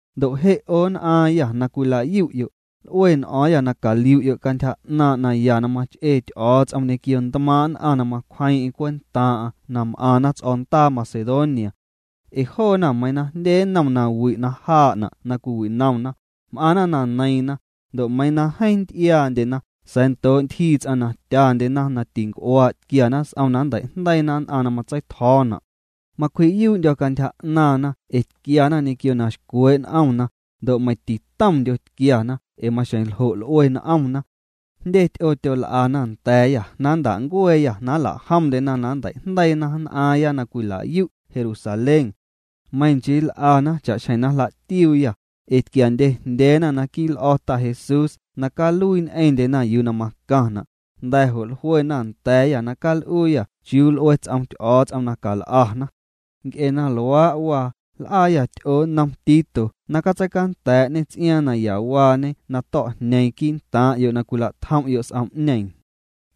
Ndo' je' 'o nn'aaⁿyâ na cwila'yu'yo', l'ue n'o̱o̱ⁿyâ na caliu'yo' cantyja 'naaⁿ' naya na mach'ee Ty'o̱o̱ts'om ñequio ntmaaⁿ' nn'aⁿ na macwjeeⁿ'eⁿ cwentaaⁿ'aⁿ na m'aⁿna ts'o̱o̱ndaa Macedonia. Ee joona meiiⁿ jndye nnom nawi' na jaa'na' na cwiwinomna, m'aⁿna na neiiⁿna, ndo' meiiⁿ na jeeⁿ nty'iaandyena sa̱a̱ ndoo' ntyjii ts'aⁿ na tyandyena na tinc'uaa' tquiana s'om na nnteijndeiina nn'aⁿ na matseitjo̱o̱na'. Macwji'yuu'ndyo̱ cantyja 'naaⁿna ee tquiana ñequio na xcwee' n'omna, ndo' meiⁿ titomndyo tquiana ee maxjeⁿ ljo' l'ue n'omna. Jndye ty'oo tyol'ana nda̱a̱yâ na nnta'ncueeyâ na nla'jomndyena na nnteijndeiina nn'aaⁿya na cwila'yu' Jerusalén. Meiⁿ nchii l'ana cha'xjeⁿ na jla'tiuuyâ, ee tquiandyejndyeena naquii' l'o̱ Ta Jesús na caluii ñ'eⁿndyena yuu na macaⁿna', nda̱ jo' jluena nda̱a̱yâ na cal'uuyâ chiuu l'ue ts'om Ty'o̱o̱ts'om na cal'ana. Nc'e na luaa' waa, l'aayâ ty'oo nnom Tito na catseicanda̱a̱'ñê ts'iaaⁿ nayawaañe na to̱'jñeeⁿ quii'ntaaⁿ'yo' na cwila'tjom'yo' s'om'ñeeⁿ.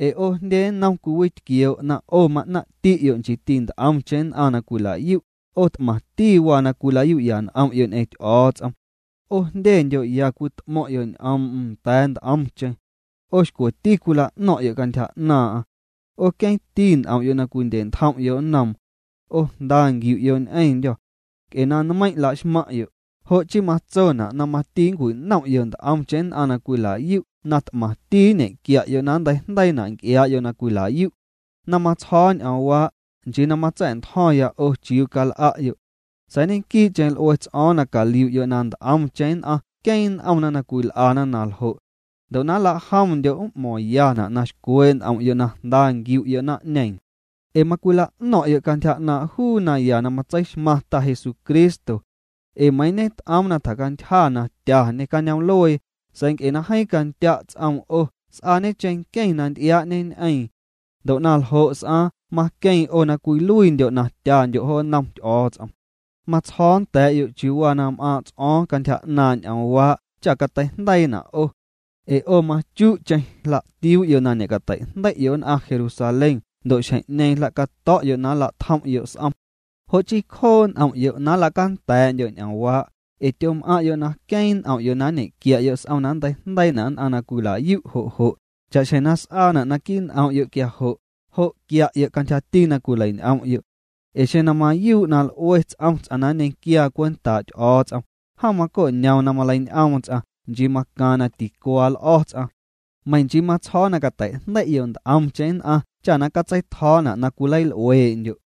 Ee 'o jndye nnom cwiwitquioo' na 'o ma'naⁿ'ti'yo' nchiiti nt'omcheⁿ nn'aⁿ na cwila'yu': 'O t'maⁿti waa na cwila'yu'ya n'om'yo' ñ'eⁿ Ty'o̱o̱ts'om. 'O jndyendyo' ya cwit'mo̱ⁿ'yo' ñ'oom'm nda̱a̱ nt'omcheⁿ. 'O xcweti cwila'no̱ⁿ'yo' cantyja 'naaⁿ'aⁿ. 'O queeⁿti n'om'yo' na cwindye'ntjom'yo' nnoom. 'O jnda nquiu'yo' ñ'eⁿndyô̱. Nc'e na nmeiⁿ' la'xmaⁿ'yo', jo' chii matsona' na mati nncwinom'yo' nt'omcheⁿ nn'aⁿ na cwilayu' na t'maaⁿ'ti nñequia'yo' na nnteijndeiina' nc'iaa'yo' na cwila'yu'. Na matsjo̱o̱ ñ'oomwaa', nchii na matsa̱'ntjo̱ⁿya 'o chiuu cal'a'yo'. Sa̱a̱ ñequii'cheⁿ l'ue ts'o̱o̱ⁿ na caliu'yo' na nt'omcheⁿ nn'aⁿ queeⁿ n'omna na cwil'ana na ljo'. Ndo' na nla'jomndyo' m'mo̱ⁿyana' na xcwee' n'om'yo' na jnda nquiu'yo' naⁿ'ñeeⁿ. Ee macwila'no̱ⁿ'yo' cantyja 'naaⁿ' juu naya na matseixmaⁿ Ta Jesucristo. Ee meiiⁿ ñet'oom na tjacantyja na tyañê cañoom'luee, sa̱a̱ nc'e na jeeⁿ candya' ts'oom 'o s'aañe cheⁿnqueⁿ na nty'iaa'ñeñ'eeⁿ. Ndo' na ljo' s'aaⁿ maqueeⁿ 'o na cwiluiindyo' na tyandyo' jo nnom Ty'o̱o̱ts'om. Matsjo̱o̱ nda̱a̱'yo' chiuu waa na m'aaⁿ' ts'o̱o̱ⁿ cantyja 'naaⁿ' ñ'oomwaa' cha cateijndeiina' 'o. Ee 'o machu'cheⁿ jla'tiuu'yo' na ñe'cateijndei'yo' nn'aⁿ Jerusalén ndo' xjeⁿ'ñeeⁿ jla'cato̱'yo' na nla'tjom'yo' s'om. Jo' chii cjoo' n'om'yo' na nla'canda̱a̱'ndyo' ñ'oomwaa', ee tyom'aⁿ'yo' na queeⁿ n'om'yo' na nñequia'yo' s'om na nnteijndeiina' nn'aⁿ na cwila'yu' jo' jo', cha'xjeⁿ na s'aana' naquii' n'om'yo' quia jo', jo' quia'yo' cantyjati na cwileiñ'om'yo'. Ee xeⁿ na mayuu' na l'ue ts'om ts'aⁿ na nñequiaa cwentaa' Ty'o̱o̱ts'om, jom maco'ñoom na maleiñ'oom ts'aⁿ, nchii macaaⁿ na ticuaa l'o̱ ts'aⁿ. Meiⁿ nchii matsjo̱o̱ na cateijndei'yo' nt'omcheⁿ nn'aⁿ cha na catseitjo̱o̱na' na cwileil'uee'ndyo'.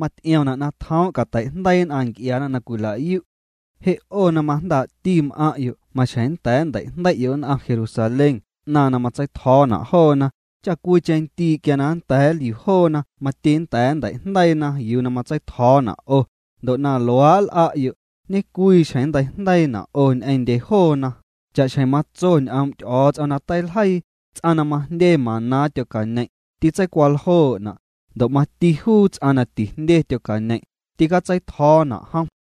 Maty'iomna' na tjoom' cateijndeii nn'aⁿ nc'iaana na cwila'yu'. Je' 'o na majndaa'ti m'aⁿ'yo' maxjeⁿ nnda̱a̱ nnteijndei'yo' nn'aⁿ Jerusalén 'naⁿ na matseitjo̱o̱na' joona, cha cwiicheⁿ ndii' quia na nda̱a̱ nliu joona mati nnda̱a̱ nnteijndeiina yuu na matseitjo̱o̱na' 'o, ndo' na luaa' nl'a'yo', ñe'cwii xjeⁿ nnteijndeiina' 'o ñ'eⁿndye joona, cha'xjeⁿ matso ñ'oom' Ty'o̱o̱ts'om na teiljeii: “Ts'aⁿ na majndye maná tyocañeⁿ', tîtseicwaljoo'na', ndo' mati juu ts'aⁿ na tijndye tyocañeⁿ', tîcatseitjo̱o̱na' jom.”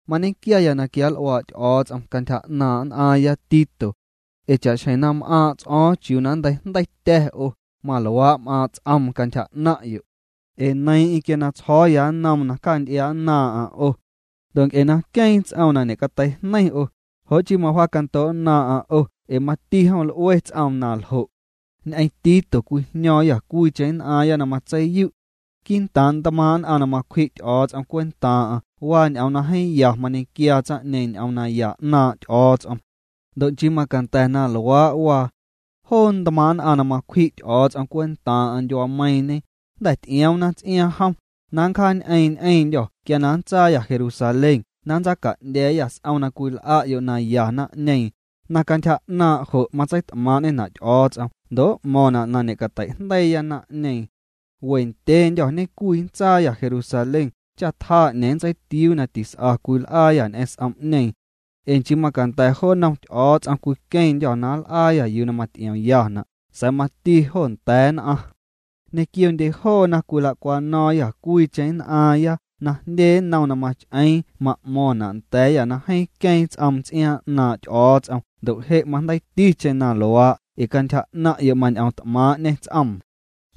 Mañequiaya na quianl'uaa' Ty'o̱o̱ts'om cantyja 'naaⁿ' nn'aaⁿya Tito. Ee cha'xjeⁿ na m'aaⁿ' ts'o̱o̱ⁿ chiuu nnteijndeitya̱ 'o, maluaa' m'aaⁿ' ts'oom cantyja 'naⁿ'yo'. Ee neiiⁿ'eⁿ quia tsjo̱o̱ya nnoom na cjaacanty'iaa'nnaaⁿ'aⁿ 'o. Ndo' nc'e na queeⁿ ts'oom na ñe'cateijneiⁿ 'o, jo' chii mawjaacando'nnaaⁿ'aⁿ 'o ee mati jom l'ue ts'oom na ljo'. Ñ'eⁿ Tito cwijño̱o̱ⁿyâ cwiicheⁿ nn'aaⁿya na matseiyu'. Quii'ntaaⁿ ntmaaⁿ' nn'aⁿ na macwji' Ty'o̱o̱ts'om cwentaaⁿ'aⁿ waa ñ'oom na jeeⁿ ya mañequiaa tsaⁿ'ñeeⁿ ñ'oom naya 'naaⁿ' Ty'o̱o̱ts'om. Ndo' nchii macanda̱ na luaa' waa. Joo ntmaaⁿ' nn'aⁿ na macwji' Ty'o̱o̱ts'om cwentaaⁿ'aⁿ ndyuaameiiⁿñe, jnda̱ ty'ioomna ts'iaaⁿ jom, na nncjaañ'eeⁿ ñ'eⁿndyô̱ quia nntsaayâ Jerusalén na nntsaaca'ndya̱a̱yâ s'om na cwil'a'yo' naya naⁿ'ñeeⁿ, na cantyja 'naaⁿ' jo' matseit'maaⁿ'ñena' Ty'o̱o̱ts'om ndo' m'mo̱ⁿna' na ñe'cateijndeiiya naⁿ'ñeeⁿ. We ndyeendyô̱ ñecwi nntsaayâ Jerusalén cha tjaa 'ñeeⁿ nntseitiuu na tis'a cwil'aayâ ñ'eⁿ s'om'ñeeⁿ. Ee nchii macanda̱ jo nnom Ty'o̱o̱ts'om cwiqueⁿndyô̱ na nl'aayâ yuu na maty'iomyana', sa̱a̱ mati jo nda̱a̱ nn'aⁿ. Ñequiondye joona cwila'cwano̱o̱ⁿyâ cwiicheⁿ nn'aaⁿya na jndye nnom na mach'eeⁿ ma'mo̱ⁿna' nda̱a̱yâ na jeeⁿ queeⁿ ts'oom ts'iaaⁿ 'naaⁿ' Ty'o̱o̱ts'om ndo' je' majndeiiticheⁿ na luaa' ee cantyja 'naⁿ'yo' mañ'oom t'maaⁿ'ñê ts'oom.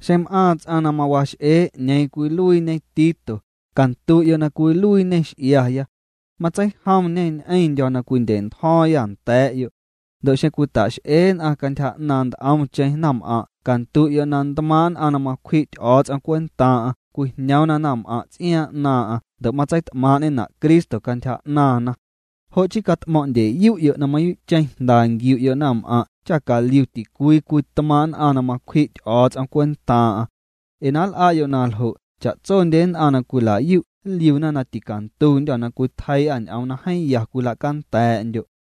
Xeⁿ m'aaⁿ ts'aⁿ na mawax'ee 'ñeeⁿ cwiluiiñe Tito, candu'yo' na cwiluiiñê x'iaya. Matseijomñê ñ'eⁿndyo̱ na cwindye'ntjo̱o̱ⁿyâ nda̱a̱'yo'. Ndo' xeⁿ cwita'x'ee nn'aⁿ cantyja 'naaⁿ nt'omcheⁿ naⁿm'aⁿ' candu'yo' na ntmaaⁿ' nn'aⁿ na macwji' Ty'o̱o̱ts'om cwentaaⁿ'aⁿ cwijñoomna naⁿm'aⁿ' ts'iaaⁿ 'naaⁿ'aⁿ ndo' matseit'maaⁿ'ñena' Cristo cantyja 'naaⁿna. Jo' chii cat'mo̱ⁿ'ndyeyu'yo' na mayuu'cheⁿ jnda nquiu'yo' naⁿm'aⁿ' cha caliu ticwii cwii tmaaⁿ' nn'aⁿ na macwji' Ty'o̱o̱ts'om cwentaaⁿ'aⁿ. Ee na nl'a'yo' na ljo', cha'tsondye nn'aⁿ na cwila'yu' nliuna na ticantundyô̱ na cwitjeii'â ñ'oom na jeeⁿ ya cwila'canda̱a̱'ndyo'.